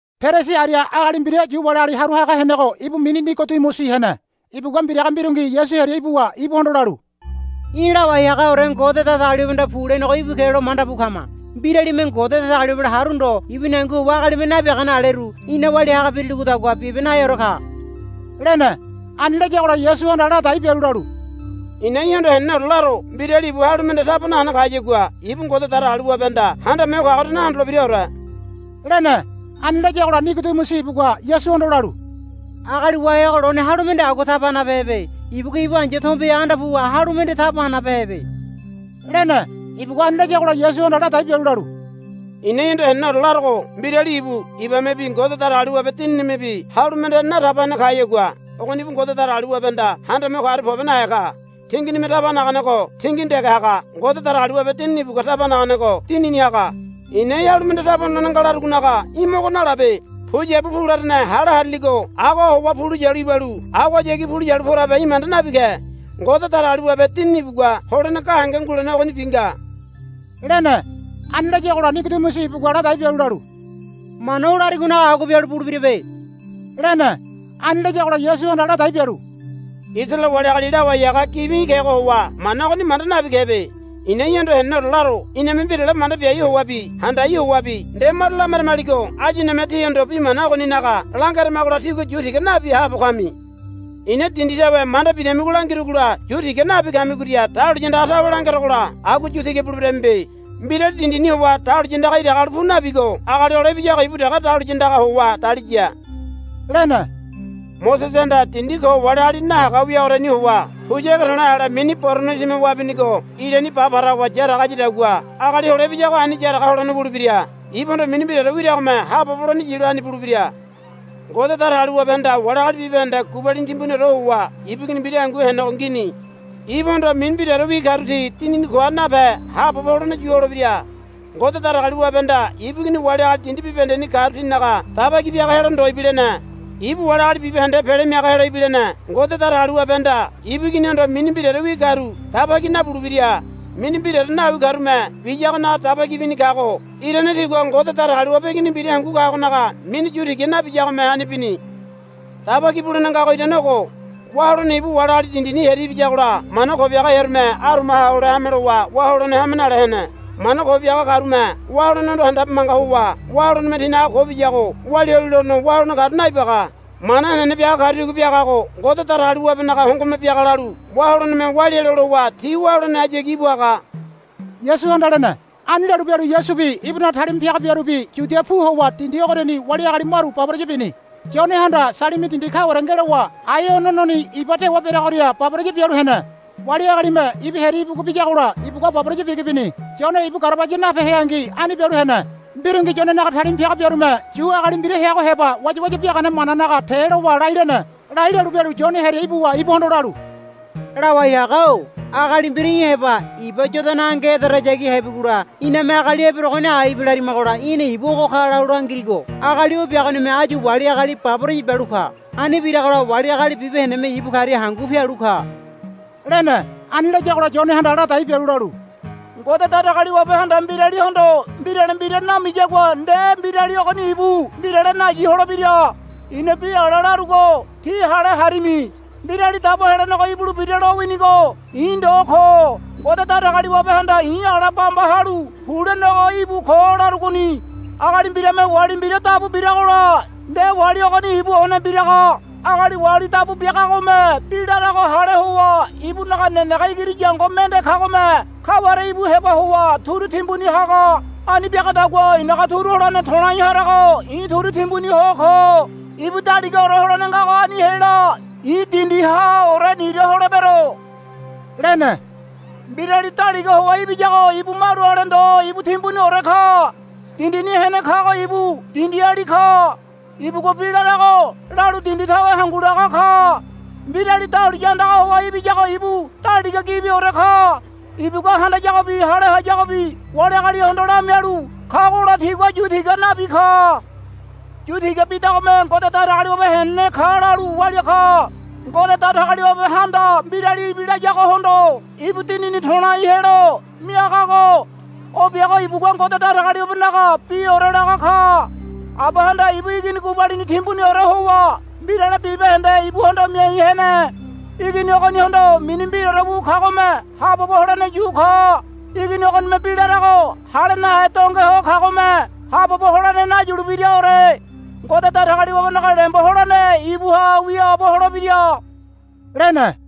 Perisi aria agali mbira Yu wali agali haru haga henego ibu mini Nigodimusi hene. Ibugua mbiraga mbirungi Yasu hearia ibuwa ibuhondo lalu, Í̠ lawai hagaore Ngode Datagaliwabehanda pu lenego íbu ke lo manda bu kama. Mbiralime Ngode Datagaliwabela haru ndo ibuni hangu howa agalime nabiagane aleru í̠na walia haga biriligodagua bibe naheore ka, lene. Ani layagola Yasuhanda ladai bialu lalu, I̱na í̠hondo heneneore laro. Mbirali ibu halu mende nataba hene kayagua ibu Ngode Datagaliwabehanda Handame Ho Kagoria nahondolebiraore, lene. Ani layagola Nigodimusi ibugua Yasuhondo lalu, Agali wahego lone halu mende agua taba hanabehebe. Ibugua ibu ai̱ya tombeha anda puwa halu mende taba hanabehebe, lene. Ibugua ani layagola Yasuhanda ladai bialu lalu, I̱na í̠hondo heneneore larogo mbirali ibu ibamebi Ngode Datagaliwabe Dininimebi halu mende nataba hene kayagua ogoni ibu Ngode Datagaliwabehanda Handame Ho Kagoria pobe nahe ka. Tinginime taba hanagago tingini dege haga. Ngode Datagaliwabe Dinini ibugua taba hanagago dinini haga. I̱na í̠ halu mende taba honolene nga larugonaga í̠ mogo nalabe. Puyabu pu larane hale hariligo agoha howa pu lo yalu ibalu agohayagi pu lo yu porabe í̠ manda nabi ke. Ngode Datagaliwabe Dinini ibugua holene gahenge ngulene ogonibi nga, lene. Ani layagola Nigodimusi ibugua ladai bialu lalu, Mana o larigonaga agua bialu bulebirabe, lene. Ani layagola Yasuhanda ladai bialu, Isaraele wali agali lawai haga gibi í̠ kego howa mana ogoni manda nabi kebe. I̱na í̠hondo heneneore laro. Iname mbirale manda biai howabi handai howabi nde maru lameramaligo áyu iname tíhondo bi mana ogoninaga langeramagola tígua yu tiga nabi haabo kami. I̱na dindi tawe manda bidamigo langirugola yu tiga nabi kamigoria dahuliya andaga tawe langerogola agua yu tiga buleberamibe. Mbirali dindini howa dahuliya andaga iraga halu pu nabigo Agali Hole Ibiyago ibu dege dahuliya andagaha howa daliya, lene. Mosesehanda dindi ko wali agali nahaga wiagoriani howa puya ege to̱le̱ ale mini boronosime wabinigo irani ba para howa yaraga hayadagua Agali Hole Ibiyago ani yaraga holene wulebira. Ibuhondo mini mbiraore wiragome haabobo holene yilo ani bulebira. Ngode Datagaliwabehanda wali agali bibahende gubalini timbuniore howa ibu Igini mbira hangu henego ngini. Ibuhondo mini mbiraorewi karu ti dinini koha nape haabobo holene yu holebira. Ngode Datagaliwabehanda ibu Igini wali agali dindi bibahendeni karu tinaga daba ki biaga helo ndo ibilene. Ibu wali agali bibahende pele miaga helo ibilene. Ngode Datagaliwabehanda ibu Iginihondo mini mbiraorewi karu daba ki nabulebira. Mini mbiraore nawi karume biyagonaga daba ki bini kago irane tigua Ngode Datagaliwabe Igini mbira hangu kagonaga mini yu tiga nabiyagome ani bini. Daba ki bulene ngago irane ogo. Wá holene ibu wali agali dindini hearia ibiyagola mana ko biaga hearume arumaha hole hame lowa wá holene hame nale hene. Mana ko biaga karume wá holenehondo handabe manga howa wá holeneme tinaga ko biyago walia holilono wá holene kagoria naibaga. Mana henene biaga karu tigua biagago Ngode Datagaliwabenaga hongome biaga lalu wá holeneme walia helo lowa ti wá holenehayagi íbu haga, Yasuhanda lene. Ani lalu bialu Yasubi ibunaga talima piaga biarubi Yudia pu howa dindi ogoriani wali agali maru baboraya bini. Yonehanda Salimi dindi kaware ngelowa Aenononi iba dewa bereagoria baboraya bialu hene. Wali agalime ibu hearia ibugu biyagola ibugua baboraya bigi bini. Yone ibu garabaya nape heangi ani bialu hene. Mbirungi Yonenaga talima piaga biarume Yu agali mbira heago heba wayawaya biagane mananaga te lowa lai lene. Lai lalu bialu Yone hearia ibuwa ibuhondo lalu, Lawai haga-o agali mbira í̠ heba iba Yodana ange ederayagi hebigola iname agali eberegoni aibe larimagola í̠na ibu ogo ka lalu langirigo agali o biagonime áyu wali agali baboraya bialu ka. Ani biragola wali agali bibahendeme ibu karia hangu pialu ka, lene. Ani layagola Yonehanda ladai bialu lalu, Ngode Datagaliwabehanda mbiralihondo mbirale mbira namiyagua nde mbirali ogoni ibu mbirale nayi holebira. I̱na bi ala larugo tí hale harimi. Mbirali Dabo Helenego ibulebira lowinigo i̱ ndo ko. Ngode Datagaliwabehanda i̱ ala bamba halu pu lenego íbu ko larugoni. Agali mbirame wali mbira dabu biragola nde wali ogoni ibu one biraga. Agali wali dabu biagagome bi larago hale howa ibunaga nenege igiri yango mende kagome kaware ibu heba howa turu timbuni haga. Ani biagadagua i̱naga turu holene to̱lai harago i̱ turu timbuni ho ko. Ibu daligaore holene ngago ani hela. I̱ dindihaore nira holebero, lene. Mbirali daliga howa ibiyago ibu maru ale ndo ibu timbuniore ka. Dindini hene kago ibu dindiali ka. Ibugua bi larago lalu dindi tawe hangu laga ka. Mbirali dahuliya andaga howa ibiyago ibu daliga gibiore ka. Ibugua handayagobi hale hayagobi wali agalihondo lamialu kagola tigua yu tiga nabi ka. Yu tiga bidagome Ngode Datagaliwabe henene ka lalu walia ka. Ngode Datagaliwabehanda mbirali ibilayagohondo ibu Dinini to̱lai helo miagago o biago ibugua Ngode Datagaliwabenaga biore laga ka. Abahanda ibu Igini gubalini timbuniore howa mbirale bibahende ibuhondo miai hene. Igini ogonihondo mini mbiraore wu kagome haabobo holene yu ka. Igini ogonime bi larago hale nahe donge ho kagome haabobo holene nayulebiraore. Ngode Datagaliwabenaga lembo holene ibuha wiaabo holebira, lene.